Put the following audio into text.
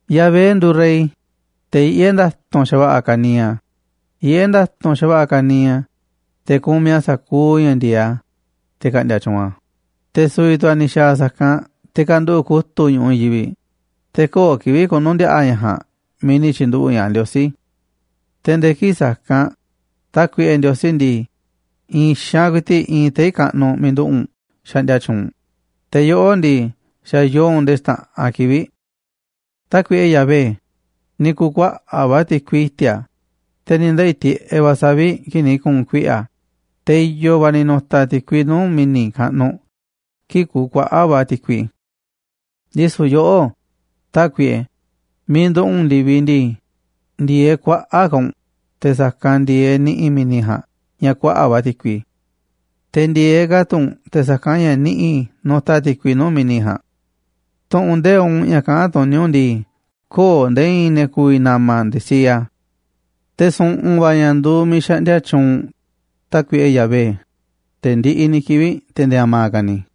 Yahvé nduuꞌ rey, te̱ yiꞌé nda̱tu̱nꞌ xa̱va̱ꞌa̱ ka̱niiꞌ a̱, yiꞌé nda̱tu̱nꞌ xa̱va̱ꞌa̱ ka̱niiꞌ a̱, te̱ kumiꞌ a̱ sa̱kuuꞌ ña̱ ndi̱e̱eꞌ a̱, te̱ ka̱ꞌndi̱a̱ tyuunꞌ a̱, te̱ su̱vi̱ tu̱ a̱ ni̱ xa̱a̱ sa̱kanꞌ te̱ kanduꞌu̱ꞌ kutu̱ꞌ ñu̱ꞌuꞌ i̱i̱n yivi̱ꞌ, te̱ köo̱ꞌ kivi̱ꞌ ku̱nu̱ndiaꞌa̱ ña̱ ja̱a̱nꞌ miiꞌ ni̱ tyi̱nduꞌu̱ꞌ ña̱ꞌaꞌ Ndiosí. Te̱ nde̱e̱ kii̱ꞌ sa̱kanꞌ, Tákuiꞌe Ndiosí ndii, i̱i̱n xaanꞌ ku̱i̱ti̱ꞌ iinꞌ tei̱ kaꞌnuꞌ miiꞌ nduꞌu̱ꞌ u̱nꞌ xaꞌndia tyuunꞌ u̱nꞌ, te̱ yoꞌó ndii, xa̱ yoo u̱nꞌ nde̱e̱ xta̱ꞌanꞌ kivi̱ꞌ. Tákuiꞌe Yahvé, ni̱ ku̱kuaꞌa̱ꞌ va̱ ti̱kui i̱ti̱a̱, te̱ ni̱ ndeꞌi̱ tiꞌeꞌ va̱ savi̱ꞌ kii̱ꞌ ni̱ ku̱u̱n kuiꞌe̱ a̱, te̱ i̱yo̱ va̱ ni̱ nu̱ta̱ ti̱kui nuu̱ꞌ mi̱ni̱ kaꞌnuꞌ kii̱ꞌ ku̱u̱ kuaꞌa̱ꞌ va̱ ti̱kui. Ndisu̱ yoꞌó, Tákuiꞌe, miiꞌ nduꞌu̱ꞌ u̱nꞌ ndi̱viꞌ ndii, ndi̱e̱eꞌ kuaꞌa̱ꞌ ka̱ u̱nꞌ te̱ sa̱kanꞌ ndi̱e̱eꞌ niꞌi̱ mi̱ni̱ ja̱a̱nꞌ ña̱ kuaꞌa̱ꞌ va̱ ti̱kui, te̱ ndi̱e̱eꞌ ka̱ tu̱ u̱nꞌ te̱ sa̱kanꞌ ña̱ niꞌi̱ nutaꞌ ti̱kui nuu̱ꞌ mi̱ni̱ ja̱a̱nꞌ. Tu̱ꞌu̱n nde̱iꞌ u̱nꞌ ña̱ kaꞌán tuní u̱nꞌ ndii, köo̱ꞌ nde̱e̱ i̱i̱n ne̱ ku̱vi̱ na̱ma̱ nde̱e̱ siee a̱. Te̱ su̱ꞌu̱n va̱ ña̱ nduuꞌ miiꞌ xaꞌndia tyuunꞌ u̱nꞌ, Tákuiꞌe Yahvé, nde̱e̱ ndiꞌiꞌ ni̱ kivi̱ꞌ, te̱ nde̱e̱ a̱ma̱ ka̱ ni̱.